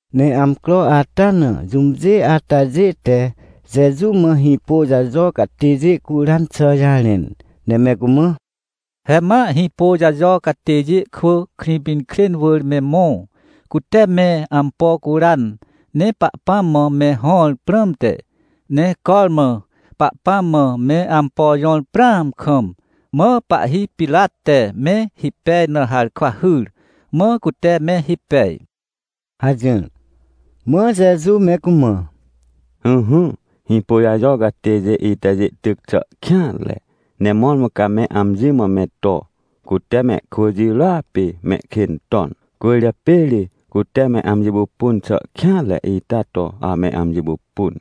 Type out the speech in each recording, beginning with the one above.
Ne amcro ata na jũmjê atajê te Jeju mã Hĩpôjajo catêjê curan xà jarẽn, ne me cumã: ― He ma Hĩpôjajo catêjê kwỳ Krĩpinkrên wỳr me mõ, cute me ampo curan, ne Pahpãm mã me hõr prãmte. Ne cormã Pahpãm mã me ampo jõr prãam kam, mã pahhi Pirat te me hipej na harkwa hyr. Mã cute me hipej ― hajỹr. Mã Jeju me cumã: ― Ỹhỹ, Hĩpôjajo catêjê itajê tyc xà kêanre, ne mõrmõ ca me amji mã me to: “Cute mehkwỳ jirôa pê mehkên ton, cwỳrjapê ri cute me amji pupun xà kêanre ita to ame amji pupun,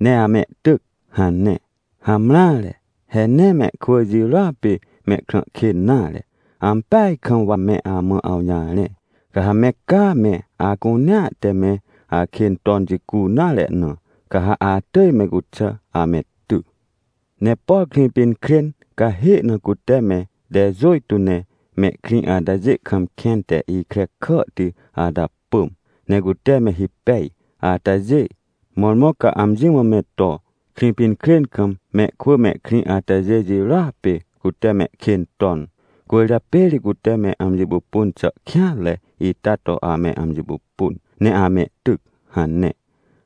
ne amehtyc” hane. Hamreare, he nee mehkwỳ jirôa pê mehkrã kên nare. Ampeaj kam wa me amã awjarẽ, ca ha me caa me acunea te me akên ton jicu nare na, ca ha atỳj me cuxà ame ty. ― Ne por Krĩpinkrên cahê na cute me tejôjtô ne mehkrĩ atajê kam kẽn te ikre kàhti ata pỳm, ne cute me hipej atajê, mõrmõ ca amji mã me to: “Krĩpinkrên kam mehkwỳ mehkrĩ atajê jirôa pê cute mehkên ton, cwỳrjapê ri cute me amji pupun xà kêanre ita to ame amji pupun ne amehtyc” hane.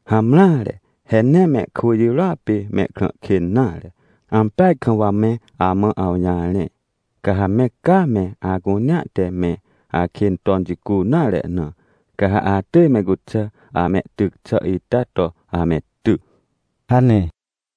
Hamreare, he nee mehkwỳ jirôa pê mehkrã kên nare. Ampeaj kam wa me amã awjarẽ, ca ha me caa me acunea te me akên ton jicu nare na, ca ha atỳj me cuxà amehtyc xà ita to ame ty ― hane.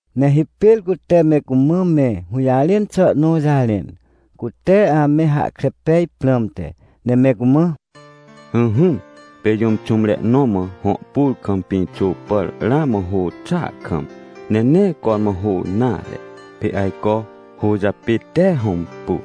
Ne hipêr cute me cumã me hũjarẽn xà nõ jarẽn, cute ame hahkre pej prãmte, ne me cumã: ― Ỹhỹ, pê jũm xũmre nõ mã hõ pur kam pĩxô pàr ramã hô xàa kam, ne nee cormã hô nare. Pê ajco hô japê, tee hõmpu,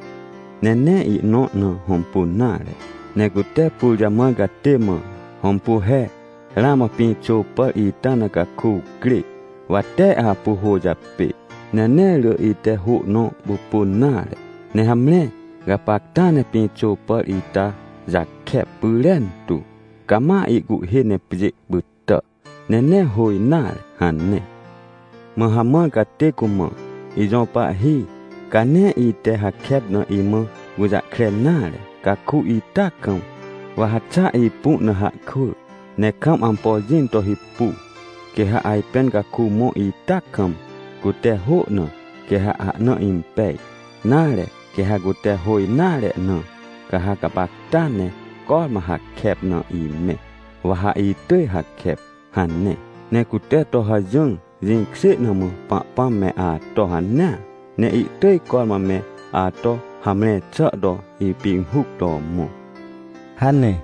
ne nee ihnõ na hõmpun nare. Ne cute pur jamãr catê mã: “Hõmpu he, ramã pĩxô pàr ita na caku crê, wa tee apu hô japê, ne nee rỳ ite hô nõ pupun nare. Ne hamre, gapacta ne pĩxô pàr ita jakep pyrentu. Cama ihcuhhê ne pjê pytà, ne nee hô nare” hane. ― Mã hamãr catê cumã: “Ijõ pahhi, ca nee ite hakep na imã gũjahkre nare caku ita kam, wa ha xa ipu na hahkwỳ, ne kam ampo jĩn to hipu. Quê ha ajpên caku mõ ita kam, cute hô na, quê ha ahna impej, nare, quê ha cute hô nare na, ca ha gapacta ne cormã hakep na imẽ, wa ha itỳj hakep” hane. Ne cute to hajỹr. Jĩkjê na mã Pahpãm me ato hanea, ne ihtỳj cormã me ato hamre xà to ipinhuc to mõ ― hane.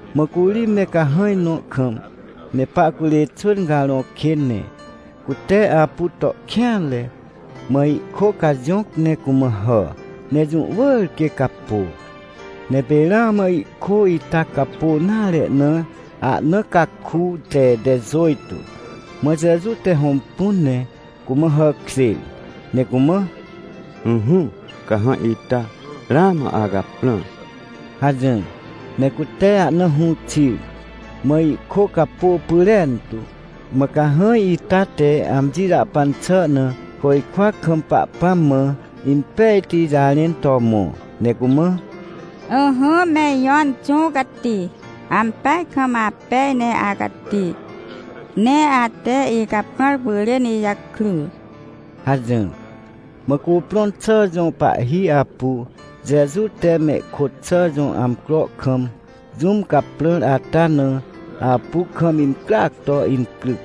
Mã curi me cahãj nõ kam me pahcurê xwỳn carõ kên, ne cute apu to kêanre, mã ihkô cajõc ne cumã hà, ne jũ wỳr quê capô. Ne pê ramã ihkô ita capô nare na ahna caku te tejôjtô. Mã Jeju te hõmpun ne cumã hàkjêr, ne cumã: ― Ỹhỹ, cahãj ita, ramã acaprãr ― hajỹr. Ne cute ahna hũ xir, mã ihkô capô pyrentu, mã cahãj ita te amji jahpan xà na, côjkwa kam Pahpãm mã impejti jarẽn to mõ, ne cumã: ― Ỹhỹ, me ijõ Inxũ Cati, ampeaj kam apej ne acati, ne ate icaprãr pyrên ijakry! ― hajỹr. Mã cuprõn xà jõ pahhi apu, Jeju te mehkôt xà jõ amcro kam jũm caprãr ata na, apu kam incryac to incryc,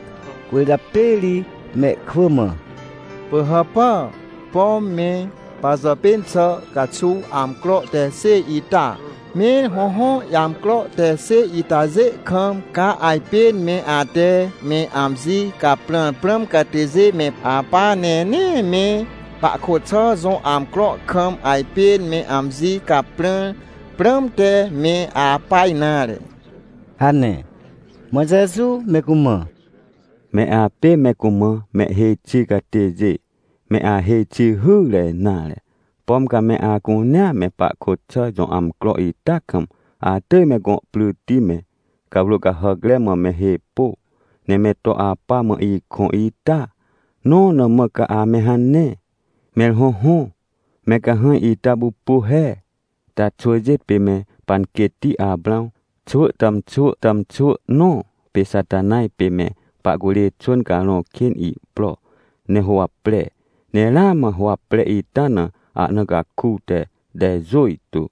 cwỳrjapê ri mehkwỳ mã: ― Pỳhàpà, pom me pajàpên xà caxuw amcro te xêj ita? Mẽr hõhõ, amcro te xêj itajê kam, ca ajpên me ate me amji caprãr prãm catêjê me apa, ne nee me pahkôt xà jõ amcro kam ajpên me amji caprãr prãmte me apa nare ― hane. Mã Jeju me cumã: ― Me apê me cumã mehhêj xi catêjê, me ahêj xi hyre nare. Pom ca me acunea me pahkôt xà jõ amcro ita kam atỳj me gõ pryti me, cawrô cahàcre mã me hê pô, ne me to apa, mã ikõ ita? Nõ na mã ca ame hane? Mẽr hõhõ, me cahãj ita pupu he, taa xwỳjê pê me panquêtti Aprãw xwỳ tàmxwỳ tàmxwỳ nõ. Pê Xatanaj pê me pahcurê xwỳn carõ kên ihpro ne huwapre, ne ramã huwapre ita na ahna caku te tejôjtô.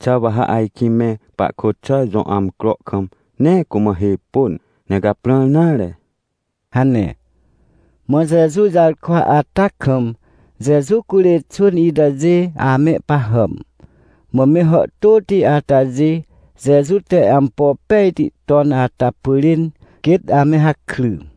Xà wa ha ajkĩ me pahkôt xà jõ amcro kam nee cumã hê pôn, ne caprãr nare? ― hane. Mã Jeju jarkwa ata kam Jeju curê xwỳn itajê amehpahàm. Mã me hàhtôti atajê Jeju te ampo pejti ton ata pyrên quêt ame hakry.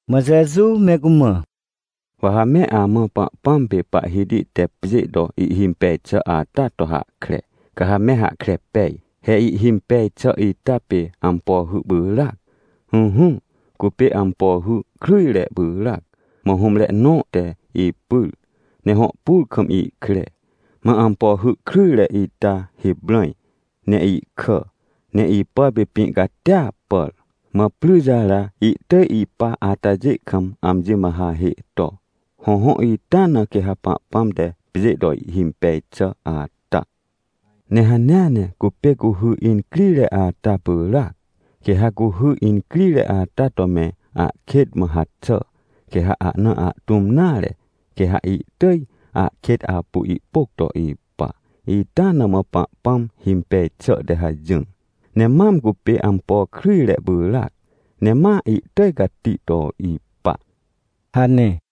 Mã Jeju me cumã: ― Wa ha me amã Pahpãm pê Pahhiti te pjê to ihhimpej xà ata to hahkre, ca ha me hahkre pej. He ihhimpej xà ita pê ampo hy pyràac. Ỹhỹ, cupê ampo hy kryjre pyràac. Mã hũmre nõ te ipyr, ne hõ pur kam ihkre. Mã ampo hy kryjre ita hiprãj ne ihkà, ne ipàr pê pĩ catia pàr. Mã pryre jara ihtỳj ihpa atajê kam amji mã hahê to. Hõhõ, ita na quê ha Pahpãm te pjê to ihhimpej xà ata. ― Ne hanea ne cupê cuhy incrire ata pyràac. Quê ha cuhy incrire ata to me ahkêt mã haxà, quê ha ahna ahtũm nare, quê ha ihtỳj ahkêt apu ihpôc to ipa. Ita na mã Pahpãm himpej xà te hajỹr, ne mam cupê ampo kryjre pyràc, ne ma ihtỳj cati to ipa ― hane.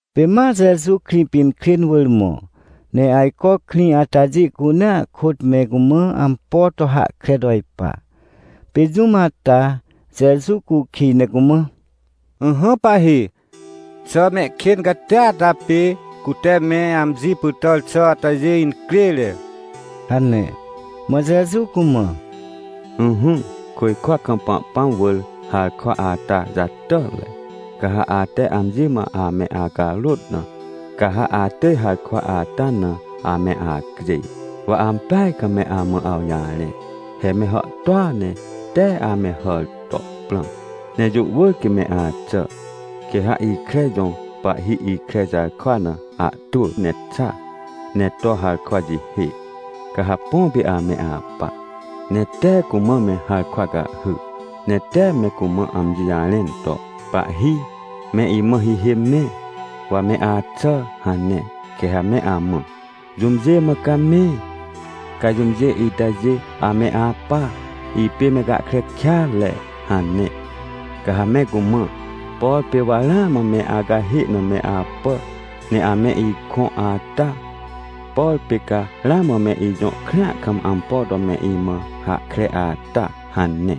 Pê ma Jeju Krĩpinkrên wỳr mõ, ne ajco krĩ atajê cunea kôt me cumã ampo to hahkre to ipa. Pê jũm ata Jeju cukij ne cumã: ― Ỹhỹ, Pahhi, xà mehkên catia ata pê cute me amji pytàr xà atajê incrêre? ― hane. Mã Jeju cumã: ― Ỹhỹ, côjkwa kam Pahpãm wỳr harkwa ata jatàtre. Ca ha ate amji mã ame acarôt na, ca ha atỳj harkwa ata na ame acjêj. Wa ampeaj kam me amã awjarẽ, he me hàhtôa ne tee ame hàr to prãm, ne jũ wỳr quê me axà. ― Quê ha ikre jõ pahhi ikre jarkwa na ahtwỳ ne xa, ne to harkwa jihê. Ca ha põ pê ame apa, ne tee cumã me harkwa cahhy, ne tee me cumã amji jarẽn to: “Pahhi, me imã hihê mẽ, wa me axà” hane. Quê ha me amã: “Jũmjê mã ca me? Ca jũmjê itajê ame apa, ipê me gahkre kêatre” hane. ― Ca ha me cumã: “Por pê wa ramã me acahê na me apà, ne ame ikõ ata? Por pê ca ramã me ijõ krĩa kam ampo to me imã hahkre ata?” hane.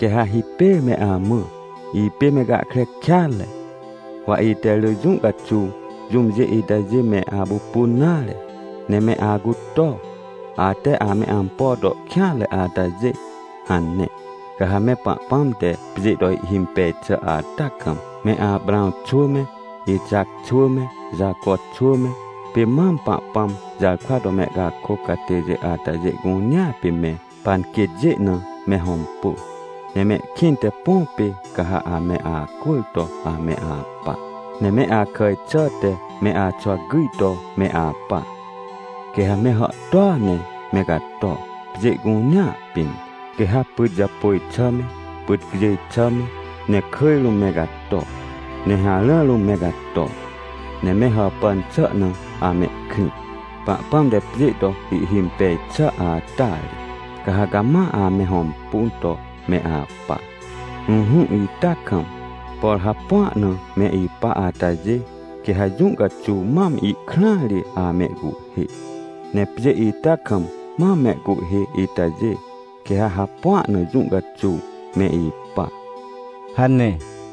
― Quê ha hipêr me amã: “Ipê me gahkre kêatre. Wa ite rỳ jũ caxuw jũmjê itajê me apupun nare. Ne me acuto, ate ame ampo to kêanre atajê!” hane. ― Ca ha me Pahpãm te pjê to ihhimpej xà ata kam, me Aprãw xwỳ me, Ixac xwỳ me, Jaco xwỳ me, pê mam Pahpãm jarkwa to mehcakôc catêjê atajê cunea pê me panquêtjê na me hõmpu. Ne mehkĩnte põ pê ca ha ame acwỳr to ame apa, ne me akàj xàhte me axwa gyj to me apa. Quê ha me hàhtôa ne me cato, pjê cunea pĩn, quê ha pyt japôj xà me, pyt cjêj xà me, ne kỳj rũm me cato, ne harã rũm me cato, ne me hàpàn xà na amehkrĩ, Pahpãm te pjê to ihhimpej xà ata ri, ca ha cama ame hõmpun to me apa. ― Ỹhỹ, ita kam, por hapua na me ipa atajê, quê ha jũ caxuw mam ihkrãa ri amehcuhhê, ne pjê ita kam mam mehcuhhê itajê, quê ha hapua na jũ caxuw me ipa ― hane.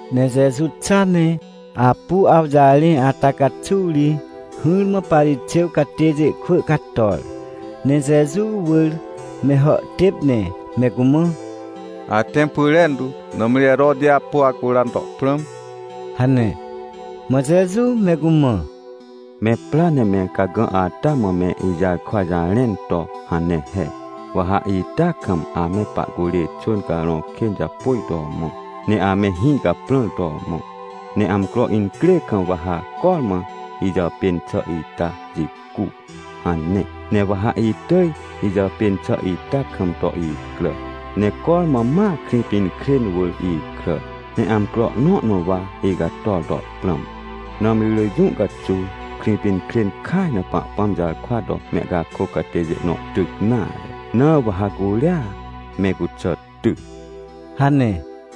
Ne Jeju xa ne apu awjarẽ ata caxuw ri hỹrmã Parixêw catêjê kwỳ cator, ne Jeju wỳr me hàhtêp ne me cumã: ― Atẽm pyrentu, nãmri Heroti apu acuran to prãm ― hane. Mã Jeju me cumã: ― Me pra ne me cagã ata mã me ijarkwa jarẽn to hane he: “Wa ha ita kam ame pahcurê xwỳn carõ kên japôj to mõ, ne ame hĩ caprãr to mõ. Ne amcro incrê kam wa ha cormã ijàpên xà ita jicu” hane. Ne wa ha itỳj ijàpên xà ita kam to icrà, ne cormã ma Krĩpinkrên wỳr ikràr, ne amcro nõ na wa icator to prãm. Nãmri rỳ jũ caxuw Krĩpinkrên kaj na Pahpãm jarkwa to mehcakôc catêjê nõ tyc nare, na wa ha curia me cuxà ty ― hane.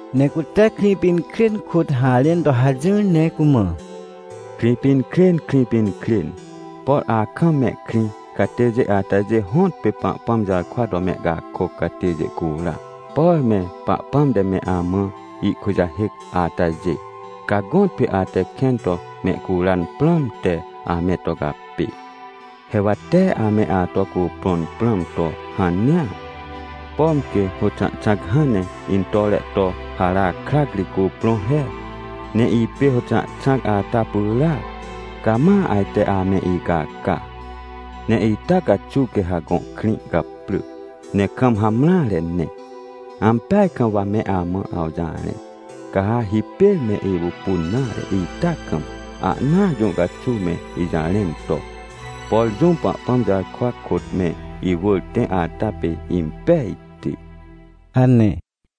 Ne cute Krĩpinkrên kôt harẽn to hajỹr, ne cumã: ― Krĩpinkrên, Krĩpinkrên, por akam mehkrĩ catêjê atajê hõtpê Pahpãm jarkwa to mehcakôc catêjê cura, por me Pahpãm te me amã ihkujahêc atajê, ca gõtpê ate kẽn to mehcuran prãmte ame to capê. He wa tee ame ato cuprõn prãm to hanea, pom quê hôxãhxãc hãn ne intore to hara krac ri cuprõ he. Ne ipê hôxãhxãc ata pyràac, ca ma ajte ame icaca. Ne ita caxuw quê ha gõ krĩ caprỳ, ne kam hamreare ne. Ampeaj kam wa me amã awjarẽ, ca ha hipêr me ipupun nare ita kam, ahnaa jũ caxuw me ijarẽn to: “Por jũm Pahpãm jarkwa kôt me iwỳr tẽ ata pê impejti” ― hane.